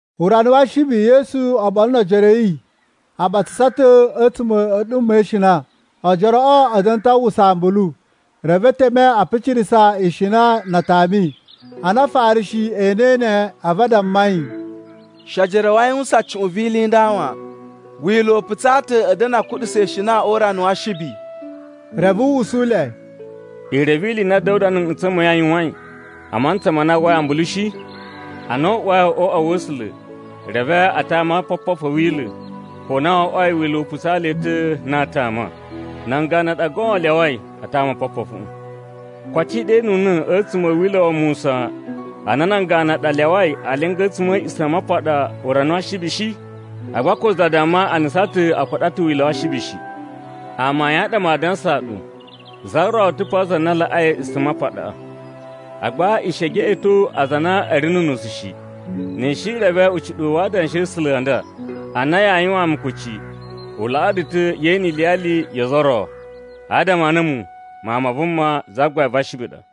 Urana wa Ashibi, Yesu oɓolo no ojoro a̱ yi a ɓatsasa ta̱ a̱tsuma̱ a̱ a̱ɗuma̱ e ishina. Ojoroꞌo a̱ da̱na̱ ta̱ a uwwusa ambulu, reve e teme a picirasa ishina na a tami. Ana Afarishi e enei ne, a̱vu a damma yi, “She ojoro a̱ wu a yuwusan cuꞌun vi ili i nda wan! Wila̱ u putsaa ta̱ a̱ da̱na̱ a kuɗusa ishina o urana wa Ashibi.” Reve u usu le, “I reve ili i na Da̱wuda na̱ nꞌutsa̱ ma̱ yi n yuwain, a mantsa ma na a uwwai ambulu shi? Ana u uwai o uꞌwa wa̱ A̱sula̱, reve a tama opopofu a̱ Wila̱, ko na wo oꞌwoi Wila̱ u putsaa le ta̱ na aa tama. Nan ganu ɗa goon a lyawai a tama opopofuꞌu. Koto i ɗenuna̱ a̱tsuma̱ a̱ Wila̱ wa Musa a na nan ganu a ɗa a lyawai a linga a̱tsuma̱ a̱ A̱a̱ꞌisamapaɗa urana wa Ashibi shi? Agba ko za damma a nusan ta̱ a kuɗa ta̱ wila̱ wa Ashibi shi. Amayun a ɗa maa dansaa ɗu, za ro ta̱ pa za na laꞌai A̱a̱ꞌisamapaɗaꞌa! Agba i shi e geꞌeto aza a na a̱ ri nu unusu shi, ni i shi i reve ucuɗuwu wa Adanshi a̱ A̱sula̱ a nda, ‘A na yaa yuwaan mu kucci, u laꞌaa ɗu ta̱ ye ene iliyali yo ozo o ro.’ Adama a na a̱mu, Mawun ma Vuma, Zagbain va Ashibi ɗa.”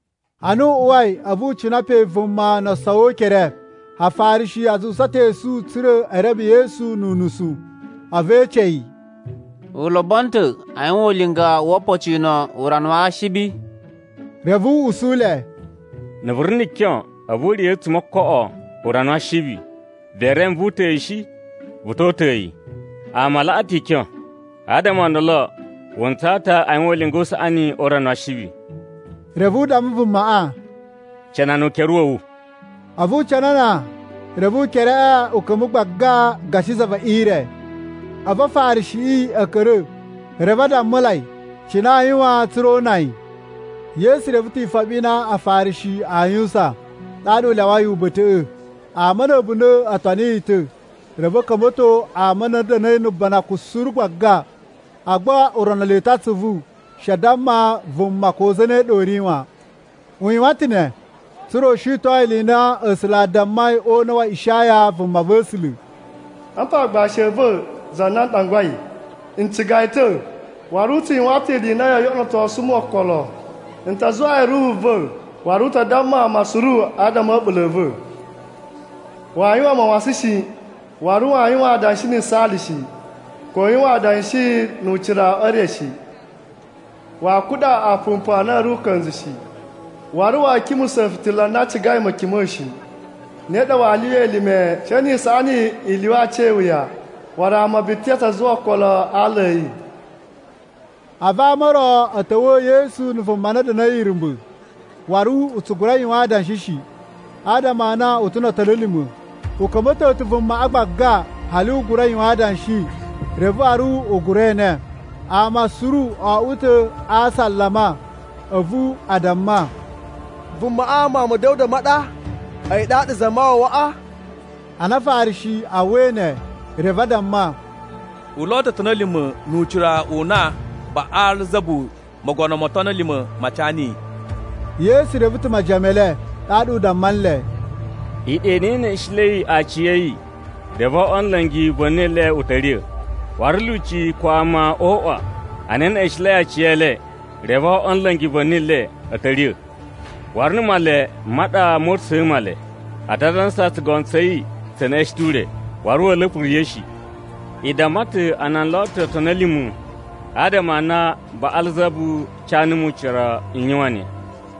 Ana u uwai, a̱vu u cina pe vuma no osowi o ukere. Afarishi a zuwusa ta̱ esu tsa̱ra̱ e reme Yesu nu unusu, a̱vu e ece yi, “U lobono ta̱ a yuwan ulinga wo opocino o urana wa Ashibi?” Reve u usu le, “Na̱ vu ri na̱ kyon, a̱vu u riya̱ a̱tsuma̱ o ookoꞌo o urana wa Ashibi, vee reme vu uta̱a̱ yi shi? Vu to uta̱a̱ yi. Ama a laꞌa ta̱ ikyon, adama o ndolo wu ntsaa ta̱ a yuwan ulinga u saꞌani o urana wa Ashibi.” Reve u damma vumaꞌa, “Canana ukere wa̱ wu.” A̱vu u canana, reve ukereꞌe u ka̱mba̱ gbaga gashi za ve ire. A̱vu Afarishiꞌi a̱ ka̱ra̱, reve a dammulai cine aa yuwan tsa̱ra̱ o una yi. Yesu reve ta̱ ifoɓi i na Afarishi aa yuwusan, ɗaɗa u lyawai uba̱ta̱ꞌa̱. Ama na̱ a̱bunda̱ o toni yi ta̱, reve u ka̱mba̱to ama a na a̱ da̱na̱i na̱ banakun suru gbaga. Agba u rono le ta̱ atsuvu she a damma vuma ko zane ɗa u ri wan. U yuwan ta̱ ne tsa̱ra̱ u shiton ili i na A̱sula̱ a dammai o una̱ wa Ishaya vumava̱sula̱: “Apa aagbashi a̱ va̱, za na n ɗangwai. N ciga yi ta̱, waru u tsu yuwan ta̱ ili i na yoo yoꞌonotosu mu okolo. N ta zuwaa yi Ruhu va̱, waru u ta damma ama suru adama a̱ a̱ɓula̱ a̱ va̱. Waa yuwan mawasan shi, waru waa yuwan adanshi ni yisaali shi, ko u yuwan adanshi nu ucira e re shi. Waa kuɗa aapumpu a na a̱ ri uka̱nzu shi, waru wa̱a̱ kimusa̱ fitila na cigai ma̱kima̱a̱ shi. Ne ɗa waa lyuwa elime she ni isaꞌani i lyuwa aci e iwuya. Waru ama biti a ta zuwa okolo a ala a̱ yi.” A̱vu ama o ro a̱ ta̱wa̱a̱ Yesu na̱ vuma na da̱na̱i irumba̱, waru u tsu gura yuwan adanshi shi, adama a na u ta̱ no otoni a̱ lima̱. U ka̱mba̱to ta̱ vumaꞌa gbaga, hali u gura yuwan adanshi reve waru u gura ene. Ama suru o oꞌwo ta̱ a asalama a̱vu a damma, “Vumaꞌa Mawun ma̱ Da̱wuda ma ɗa? A̱yi ɗaɗa Zamawawaꞌa?” Ana Afarishi a uwwai ne, reve a damma, “U lo ta̱ otoni a̱ lima̱ nu ucira u na Baꞌalzabu, mogono mo otoni a̱ lima̱ ma ca niyi.” Yesu reve ta̱ majiyan me le, ɗaɗa u damma nle, “Iɗa i na i neꞌeshenlei aciya̱yi, reve o oꞌwo a̱ la̱ngi va̱ni le u ta̱ riya̱. Waru lyuci ko ama o uꞌwa a na e neꞌeshenlei aciyele, reve o oꞌwo a̱ la̱ngi va̱ni le a̱ ta̱ riya̱. Waru na̱ Male ma ɗa moo uta̱sa̱a̱ Male, a ta dansa tsugono tsa̱ yi tse neꞌeshen ta̱ ure, waru wa̱a̱ la̱pa̱ riya̱ shi! I damma ta̱ a na n lo ta̱ otoni a̱ lima̱ adama a na Baꞌalzabu ca numu ucira n yuwan ne.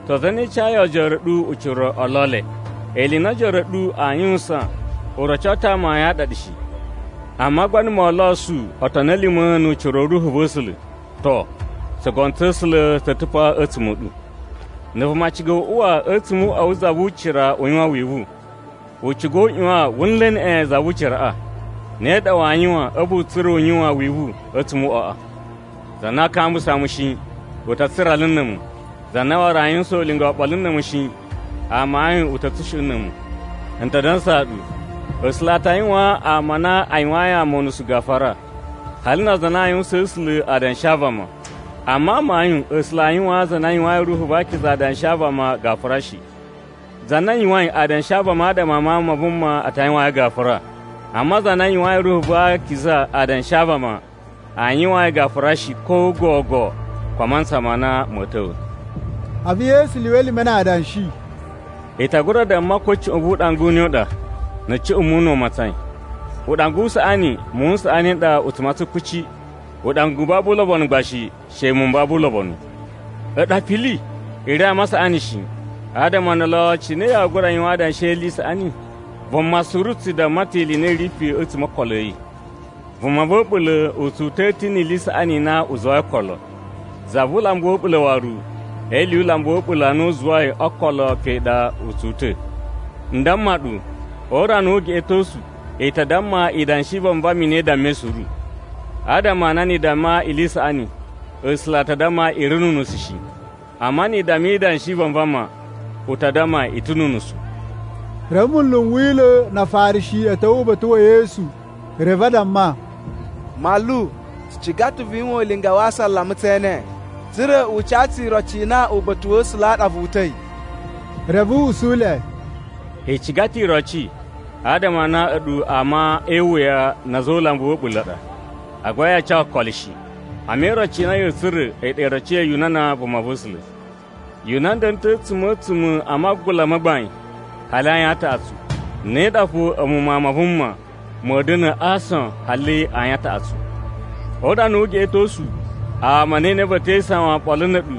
To, zane cayi ojoro a̱ ɗu ucira o lo le? Ili i na ojoro a̱ ɗu aa yuwusan u roco ta̱ amayun a ɗa ɗu shi! Amma gba na̱ moo losu otoni a̱ lima̱ nu ucira u Ruhu va̱ A̱sula̱, to, tsugono tsa̱ A̱sula̱ tsa̱ ta̱ pa a̱tsuma̱ a̱ ɗu. “Na̱ vuma ciga u uwa a̱tsuma̱ o uꞌwa wu za vu ucira u yuwan wivu, u ciga u ꞌyuwan wu nla̱ neꞌen za vu uciraꞌa. Ne ɗa waa yuwan a̱vu u tsura̱ u yuwan wivu a̱tsuma̱ o uꞌwaꞌa. “Za na aa kambusa mu shi, u ta tsurala na̱ a̱mu. Za na waru aa yuwusan ulinga oɓolo na̱ a̱mu shi, amayun u ta̱ tsushuꞌun na̱ a̱mu. N ta dansaa ɗu, A̱sula̱ a ta yuwaan ama a na a yuwayin ama unusu gafura, hali na aza a na aa yuwusaan A̱sula̱ adanshi a vama. Amma amayun A̱sula̱ aa yuwaan aza a na a yuwayin Ruhu va Akiza adanshi a vama gafura shi. Za na yuwain adanshi a vama adama a Mawun ma Vuma a ta yuwaan yi gafura, amma za na yuwayin Ruhu va Akiza adanshi a vama, aa yuwaan yi gafura shi, ko gogo, ko a mantsa ma na ma̱a̱ ta̱wa̱.” A̱vu Yesu lyuwa elime na adanshi, “I ta gura damma ko cuꞌun vu uɗanga u ne u ɗa, na̱ cuꞌun muwun n na u matsain. Uɗanga u saꞌani, muwun n saꞌani n ɗa u tsu matsan kuci, uɗanga u babu ulobonu gba shi, she muwun m babu ulobonu. A̱ɗu apili! I ri ama a saꞌani shi, adama o ndolo cine yaa gura yuwan adanshi e ili i saꞌani? Vuma suru u tsu damma ta̱ ili i na i ri pe a̱tsuma̱ o ookolo a̱ yi. Vuma va̱ a̱ɓula̱ u tsu uta̱a̱ ta̱ ni ili i saꞌani i na u zuwai o ookolo, za vu ulambu wa̱ a̱ɓula̱ waru e ili yu ulambu wa̱ a̱ɓula̱ a na u zuwai o ookolo pe ɗa a̱ tsu uta̱. N damma ɗu, o urana wu ugeꞌetosu i ta damma idanshi i vanvama i na i dammai suru. Adama a na ni i damma ili i saꞌani, A̱sula̱ a ta damma i ri nu unusu shi. Amma ni i damma idanshi i vanvama, u ta damma i ta̱ nu unusu.” Reve, munlu n Wila̱ na Afarishi a̱ ta̱wa̱ uba̱ta̱ wa̱ Yesu, reve a damma, “Manlu, tsu ciga ta̱ vu yuwan ulinga wa asalama tse ene, tsa̱ra̱ u ca tsu iroci i na uba̱ta̱ wa̱ A̱sula̱ ɗa vu uta̱i.” Reve u usu le, “I ciga ta̱ iroci adama a na a̱ɗu ama e iwuya na̱ a̱za̱ o ulambu wa̱ a̱ɓula̱ a ɗa, agba yaa ca okolo shi! Amma iroci i na ya̱a̱ tsura̱ a̱yi ɗa iroci ya Yunana vumava̱sula̱. Yunana da̱na̱ ta̱ a̱tsuma̱ a̱ a̱a̱tsuma̱ a magula ma gbain hali ayin a taꞌatsu. Ne ɗa fo a̱mu Mawun ma Vuma ma̱a̱ da̱na̱ a aason hali ayin a taꞌatsu. O urana wu ugeꞌetosu, ama a̱ Niniva e te isawan oɓolo na̱ a̱ɗu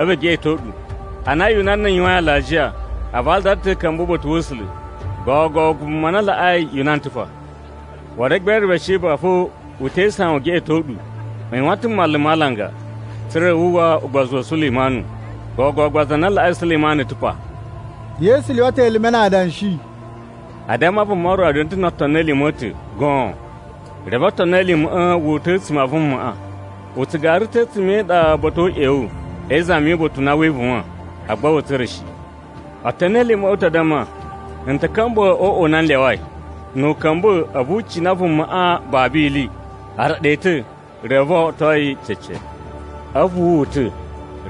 a̱vu e geꞌeto ɗu. Ana Yunana yuwain alajiya, a vadala ta̱ a̱ ka̱mba̱ uba̱ta̱ wa̱ A̱sula̱. Gogo vuma na laꞌai Yunana ta̱ pa. Waru Egbere va Sheba fo u te isawan u geꞌeto ɗu. U yuwan ta̱ mmalu ma alanga, tsa̱ra̱ wu uwwa ugbozu wa̱ Sulemanu. Gogo gba za na laꞌai Sulemanu ta̱ pa.” Yesu lyuwa ta̱ elime na adanshi, “A damma vuma ro da̱na̱ ta̱ no otoni a̱ lima̱ a̱ ta̱ goon. Reve otoni a̱ lima̱ꞌa̱ wu uta̱ a̱tsuma̱ a vumaꞌa, u tsu gara ta̱ a̱tsuma̱ e iɗa ba̱ta̱ o uꞌyewu e izami yu uba̱ta̱ u na wee ivuwan, agba wa̱a̱ tsura̱ shi. Otoni a̱ lima̱ꞌa̱ u ta damma, ‘N ta̱ ka̱mba̱ o uꞌwa u na n lyawai.’ Nu u ka̱mba̱, a̱vu u cina uꞌwaꞌa babu ili. A raɗa yi ta̱, reve o oꞌwoto yi cece. A̱vu wu uta̱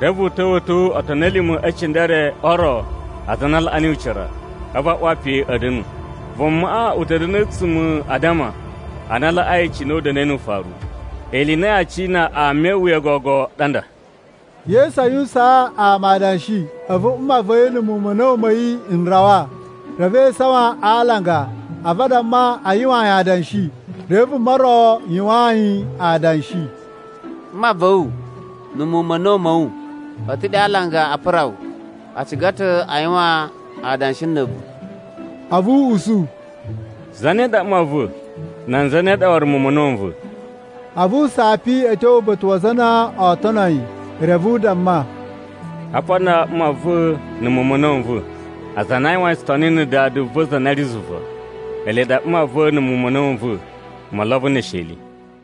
reve u ta̱wa̱to otoni a̱ lima̱ e cindere o ro aza a na a laꞌa niyi ucira, a̱vu a uwa pe a̱ da̱nu. Vumaꞌa u ta̱ da̱na̱ a̱tsuma̱ a addama a na a laꞌai cine u da̱na̱i nu ufaru. Ili i na yaa cina ama e iwuya o gogo ɗa nda.” Yesu a yuwusaan ama adanshi, a̱vu mma va̱ yi na̱ muwun ma̱ a̱na̱wu ma̱ yi n rawa. Reve e isawan a alanga a̱vu a damma a yuwaan yi adanshi. Reve vuma ro yuwaan yi adanshi, “Mma va̱ wu na̱ muwun ma̱ a̱na̱wu ma̱ wu a̱ ta̱ ɗe a alanga a pura wu, a ciga ta̱ a yuwan adanshi na̱ a̱vu.” A̱vu u usu, “Zane ɗa mma va̱? Nan zane ɗa waru muwun ma̱ a̱na̱wu n va̱?” A̱vu u sapi a̱ tyo uba̱ta̱ wa aza a na oo tono yi reve u damma, “Apa nan mma va̱ na̱ muwun ma̱ a̱na̱wu n va̱. Aza a na a yuwain tsutoni na̱ Dada va̱ za na ri zuva, ele ɗa mma va̱ na̱ muwun ma̱ a̱na̱wu n va̱ mo olobo ne esheli.”